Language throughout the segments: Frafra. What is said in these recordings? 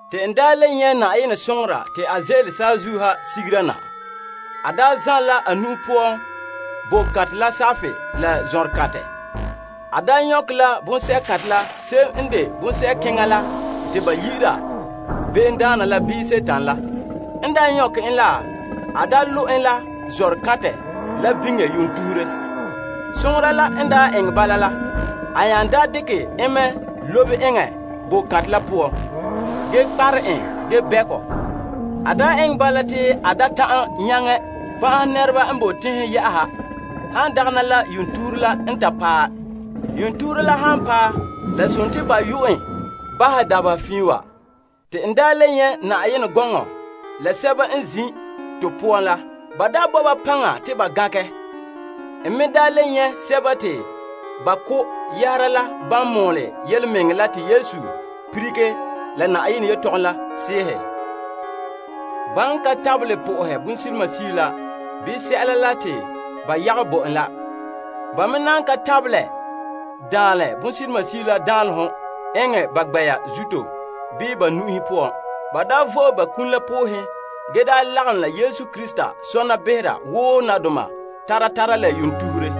Te n le nyɛ' Yenɛ soŋora te a ze'ele saazuo ha sigera na. A zanlɛ la a nu'o poan boko kantɛ la kparehega la zɔnrekantɛ. A nyɔkɛ la bonsɛ'kantɛ la se'em n de bonsɛ'kɛka la te ba yi'ira Sagona bii Dima la. N nyɔkɛ en la, a lo' en la zɔnrekantɛ la biŋe yuun tuhure. Soŋora la n eŋɛ bala la, a nya dekɛ en mɛ lobe eŋɛ boko kantɛ la poan, ge kparɛ en ge bɛ' kɔ. A eŋɛ bala te a da ta'an nyaŋɛ pan'ahɛ nɛreba n boe teŋhe yɛ'ɛha, han dagɛna la yuun tuhure la n ta paɛ. Yuun tuhure la han paɛ, la sontii ba yo'ɛ en bahɛ dabeha fiin wa. Te n le nyɛ' na'am gɔnɔ, la sɛba n zin' to poan la. Ba bo ba paŋa te ba gankɛ. N me le nyɛ' sɛba te ba ko' yɛhera la ban mɔɔlɛ yelemɛŋɛrɛ la te Yesu lilige la Yenɛ yelehom la sɛɛhe. Ba n ka tabelɛ na'ahe bonsilimasio la bii sɛla la te ba yagom bo en la. Ba me na ka tabelɛ daanlɛ bonsilimasio la danlehom la eŋɛ ba gbɛ'ɛra zuto bii ba nu'uhen poan. Ba vo'e ba kum la poohen ge lagom la Yesu Krista sɔna behera wo nadoma tara tara la yuun tuhure.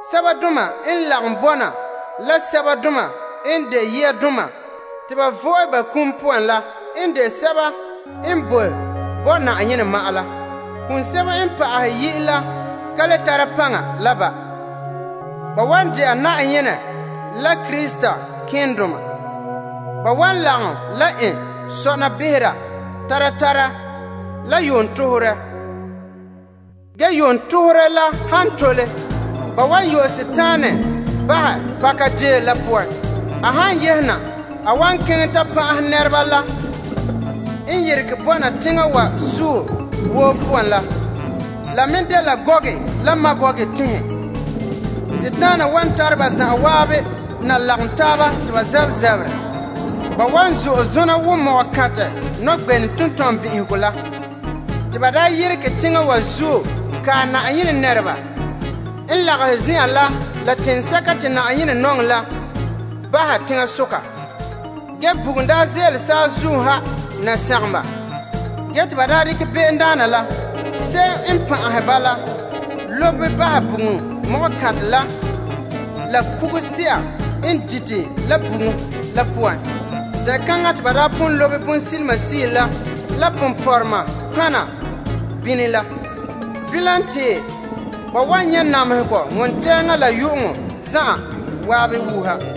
Sɛba doma n lagom bɔna la sɛbadoma n de yiadoma te ba vo'e ba kum poan la n dela popeelom la toolom nɛreba. Kum sebo n pa'ahɛ yi' la ka le tara paŋa la ba. Ba wan de'a Yenɛ la Krista malemadoma. Ba wan lagom la en sɔna behera tara tara la yuun tuhure. Ge yuun tuhure la ha tole, ba wan yu'ɛ Dima pakadeen la poan bahɛ. A han yehe na, a wan keŋɛ ta pan'ahɛ teŋhe n yerege bɔna teŋa wa zuo woo n de Gog la Magog la. Dima wan tare ba zan'an na lagom taaba te ba zabɛ zaberɛ. Ba wan zo'e zona wo ko'kantɛ nɔgbenɛ tentɔnbin'ihegɔ la. Te ba yeregɛ teŋa wa zuo kae Yenɛ nɛreba n lagahɛ zen'an la la teŋsɛka te Yenɛ nɔŋɛ la bahɛ teŋasoka. Ge bugum ze'ele saazuo ha na sagom ba. Ge te ba dekɛ sagona la, se'em n pan'ahɛ ba la lobe bahɛ bugum ko'kantɛ la la kuguse'a n dite la bugum la poan. Zen'kaŋa te ba pon lobe bonsilimasio la la nɔtɔgɔha ponpɔrɔŋdoma bini la. Bilam, te ba wan nyɛ' namehegɔ wontɛɛŋa la yu'uŋɔ zan'an wuuha.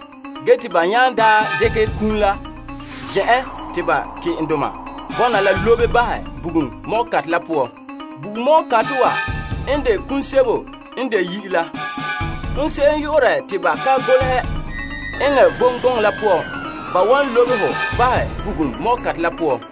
Ge te ba nya daa dekɛ kum la Ke'enteŋa la lobe bahɛ bugum ko'kantɛ la poan. Bugum ko'kantɛ wa n de kum sebo n de yi'i la. Hon se'em yu'urɛ te ba ka golehɛ eŋɛ vom gɔŋɔ la poan, ba wan lobe ho bahɛ bugum ko'kantɛ la poan.